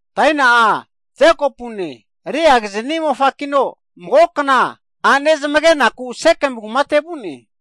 Daina'a Jekopune, Leagini mofakino mago kna a'ne zamagenaku vu'ne.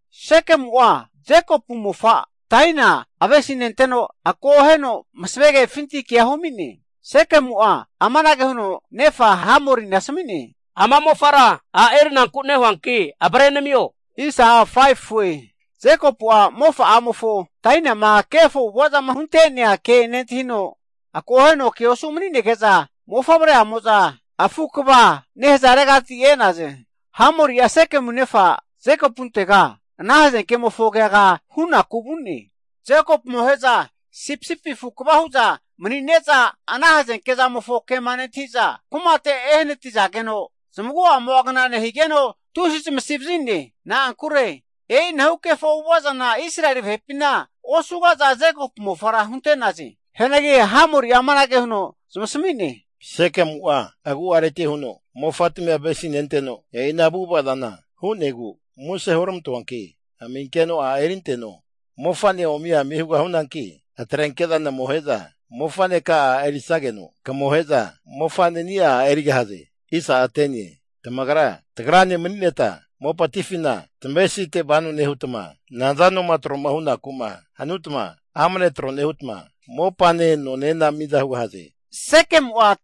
Sekemu'a, Jekopu mofa Daina avesinenteno, akoheno masve kefinti ke humi'ne. Sekemu'a nefa Hamori asmi'ne, Ama mofara a' erinaku nehuanki avre namio. Jekopu'a mofa'amofo Daina kefo avu'avazama hunte'nea ke nentahino, akoheno ke osu mani'nege'za, mofavre'amo'za lama afu kva nehzaregati e'naze. Hamori'a Sekemu nefa Jekopuntega ana hazenke'mofo keaga hunaku vu'ne. Jekopu amohe'za sipisipi afu kva hunareti, ana hazenke zamofo ke nentahiza, kumate ene hnatiza, zamagua kna nehzageno tusi zamasi vazi'ne. Na'ankure, e'inahu kefo avu'avazana Israeli vahepina osugaza, Jekopu mofara hunte'naze. E'inahu avu'avazana osugaza hu'ne. Hianagi Hamori'a zamasmi'ne. Sekemu'a agu'areti avesinenteno e'i ana avu'avazana hu'negu, muse hurmantoanki aminkeno a' erinteno. Mofa omiami hugahune, namohe'za mofaneka'a, a' erisageno, kamohe'za, mofa'nenia a' erigahaze. Tamagra, tagrane manineta, mopatifina tamevesite vano nehutma, nazanoma troma hunaku'ma hanutma amne tro hugahaze. Sekemu'a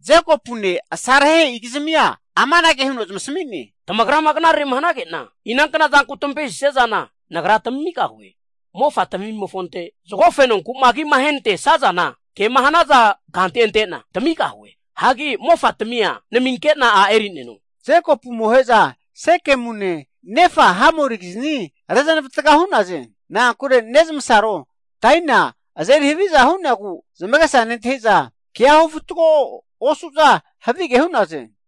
Jekopune amohe'igizmia amanage huno zamasmi'ne. Tamagrama knarere hnage'na, inankna zanku tamavesisia zana nagra tamigahue. Mofa tamimofonte zgo fenonku'ma agima ahenantesazana, kema hnazagante tamigahue, hagi mofa tamia naminke'na a' eri'neno. Jekopu amohe'za Sekemune nefa Hamorigizni reznavatga hu'naze, na'ankure nezmasaro Daina azeri haviza hu'negu zamagesa nentahiza, kea hufatgo osu'za havige hu'naze.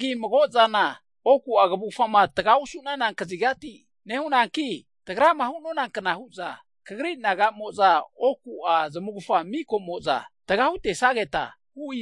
Mago'zana oku kvufama tga osu'nana kazigati nehune, tagra hu'nonakna huza, kagri nagamo'za oku zamufga mika'moza tga hiho.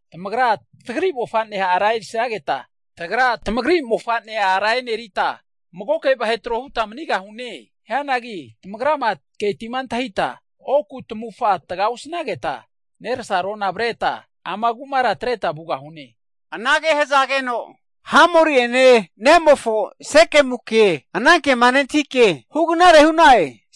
Tamagra tagri mofane ara erisageta, tagra tamagri mofane enerita magoke vahe trohuta manigahune. Hanki tamagrama ketima antahita oku tamufga taga osnageta, nersarona avreta ama kumara atreta vugahune. Hamori ene nemofo Sekemuke anankema nentahike hugnarere hu'na'e.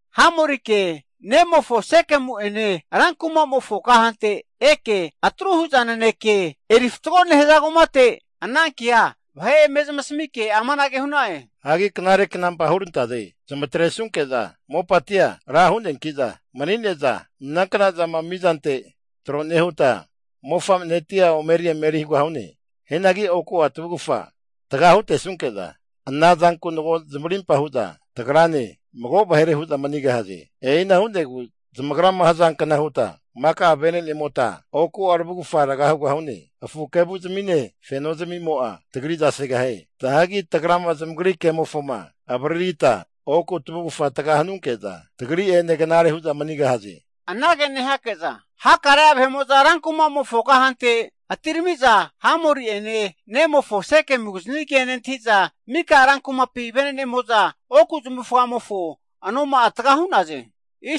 Hamorike nemofo Sekemu ene ran kumamofo kahante eke atru huza kenaneke fatgo nehaza kumate vahe anankea eme zamasmina'e. Ana vahemo'za knare knampa hurantaze, zamatre sunke'za mopatimo'a ra hu'neakiza mani'neza, inankna'zana mizante tro nehuta, mofanetia omeri emeri hugahune. Oku tavufga tga hutesunke'za, anamo'za mago zamarimpa hu'za tagrane, mago vahere hu'za mani'gahaze, e'igu zamagra hzankna huta maka'a vene'nemota oku tvufga tga hugahune. Afu kevuzimine, feno zamimo'a tagriza segahie. Hanki tagrama zamagri kemofo avaririta oku tavufga tga hanunke'za tagra'ene knare hu'za manigahaze. Hakare'a vahe'mo'za rankumamofo kahante atiramiza, Hamori ene, nemofo Sekemugini ke nentahiza, mika venenemo'za oku zamufga anoma'a tga hu'naze.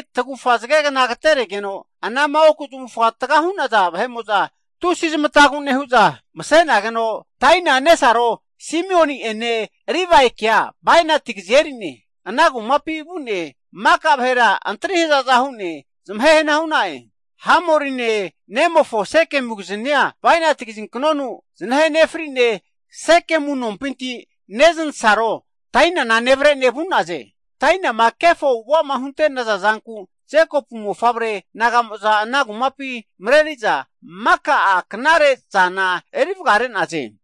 Tagufa zge agteregeno anama oku zamufga tga hunaza vahemo'za tusi zamatazmampi mse'nageno, Daina nesaroke Simioni ene, Livaike zaza kazi (bainat) eri'ne, ana kumapi vu'ne maka'a vahera antri hzaza hu'ne zamahe hana hu'na'e. Hamorine nemofo Sekemu'giznia kazinknonu (bainat) znahe nefri'ne, Sekemu nompinti neznasaro, Daina nevrene vu'naze. Dainama kefo avu'avama hunte'naza zanku, Jekopu mofavre nagamo'za ana kumapi mreri'za, maka'a knare'zana eri vgare'naze.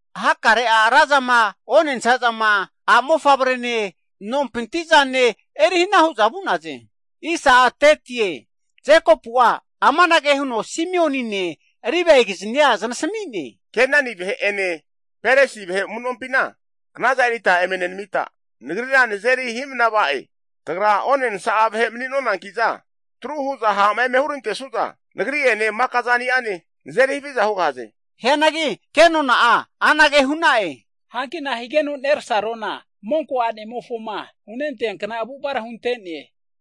Hakare'a razama, onensa zama, a' mofavrene nompinti zane erihna huza vu'naze. Jekopu'a amanage huno Simionine, Livaigiznia znasmi'ne, Kenani vahe ene, Perizi vahe amu'nompina knaza erita nagrira nazeri hi'mna va'e. Tagra onensa'a vahe mani'nonankiza, atru huza ha'ma eme hurantesuza, nagri ene maka zaniane nazeri haviza hugahaze. Hianagi kenona'a anage hu'na'e, hanki nahigeno nersarona, monko a'nemofo hianknara hunte'ne?